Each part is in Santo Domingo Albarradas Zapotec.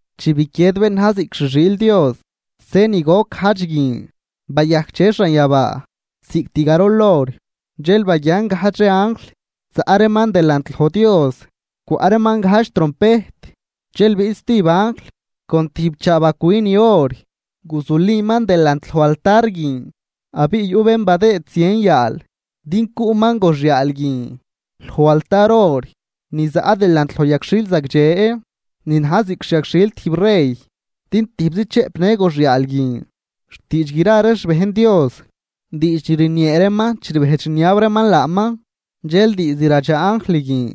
Chi biquied bén na̱j ziꞌc xi xiil Dios se ni goc gajdx guin, bayajcdxe xanyabaa cost garol hor. Dxel baguian gajdx ree anjl zaꞌ reeman delant loj Dios, cwaꞌ reeman gajdx trompejt. Dxel biꞌt stijb anjl con tijb chaabacwi ni or, guzuliman delant lo altar guin abiꞌ yuꞌ bén badëëd zien yaal din cuꞌman goxyaal guin loj altar or ni zaꞌ delant loj yagxhil zagdxe ni na̱j ziꞌc xyagxhil tijb rey, din tijbzi chëꞌpnë goxyaal guin xtiidx gra ree xbejn Dios, diidx ni rniee reeman chi rbejdx rniab reeman laaman. Dxel diizd ladxaa anjl guin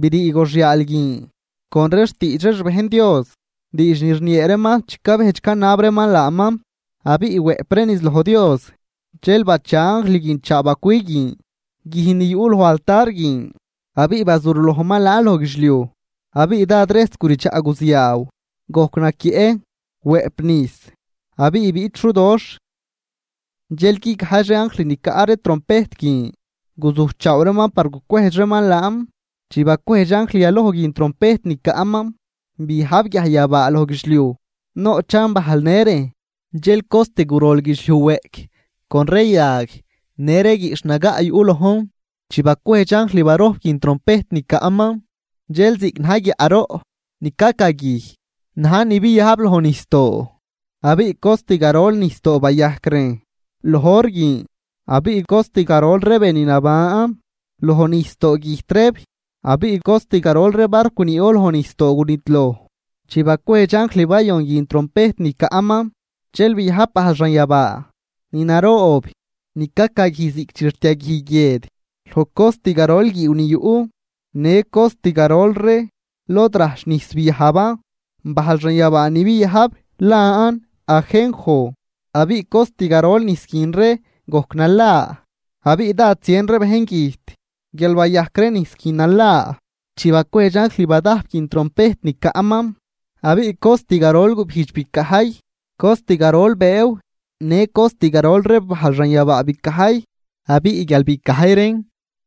brii goxyaal guin con ree xtiidx ree xbejn Dios, diidx ni rniee reeman chi cabejdx canab reeman laaman, abiꞌ wëꞌp reen niz loj Dios. Dxel bacha anjl guin chaabacwi guin guij ni yuꞌ loj altar guin abiꞌ bazurlojman laan loj guidxliuj. Abiꞌ dád rejs guridxaꞌ guziaaw, gojc naquieꞌ, wëꞌp nijs, abiꞌ biꞌt xudoxh. Dxel guigajdx ree anjl ni caꞌ ree trompejt guin, guzujchaaw reeman par gucwejdx reeman laan. Chi bacwejdx anjl yaloj guin trompejt ni caꞌman, biajb guiajyabaa loj guidxliuj noꞌchan bajl në rejn. Dxel cost gurol guidxliuj weꞌc con ree yag në ree guiꞌxh nagaꞌ yuꞌ lojn. Chi bacwejdx anjl barojp guin trompejt ni caꞌman, dxel ziꞌc na̱j guiaꞌroꞌ ni cacaguij na̱j ni biajb loj nijsdoo, abiꞌ cost garol nijsdoo bayajcan rejn loj hor guin. Abiꞌ cost garol ree be ni naban loj nijsdoo güjt reeb abiꞌ cost garol ree barcw ni yuꞌ loj nijsdoo gunidloj. Chi bacwejdx anjl bayon guin trompejt ni caꞌman, dxel biajb bajl xanyabaa ni naroob ni cacaguij ziꞌc chi rtiaguij guied, loj cost garol guiiw ni yuꞌ në cost garol ree lod rajch nijs biajban. Bajl xanyabaa ni biajb lan Ajenjo, abiꞌ cost garol nijs guin ree gojc nala abiꞌ dád zien ree bejn güjt guial bayajc ree nijs guin nala. Chi bacwejdx anjl badajp guin trompejt ni caꞌman, abiꞌ cost garol gubijdx bicajy, cost garol bëëw në cost garol ree bajl xanyabaa bicajy. Abiꞌ guial bicajy reen,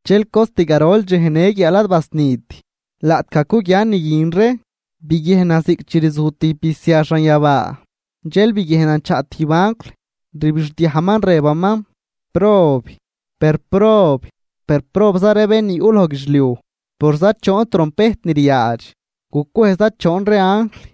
dxel cost garol dxej në guiaal ad basnit. Laꞌtgaj cuguian ni guin ree, biguiejnan ziꞌc chi rzuj tijb bisia xanyabaa. Dxel biguiejnan chaꞌ tijb anjl rbixdiajman rëbaman: ―¡Prob, per prob, per probza ree bén ni yuꞌ loj guidxliuj por zachoon trompejt ni ryaadx gucwejdx za choon ree anjl!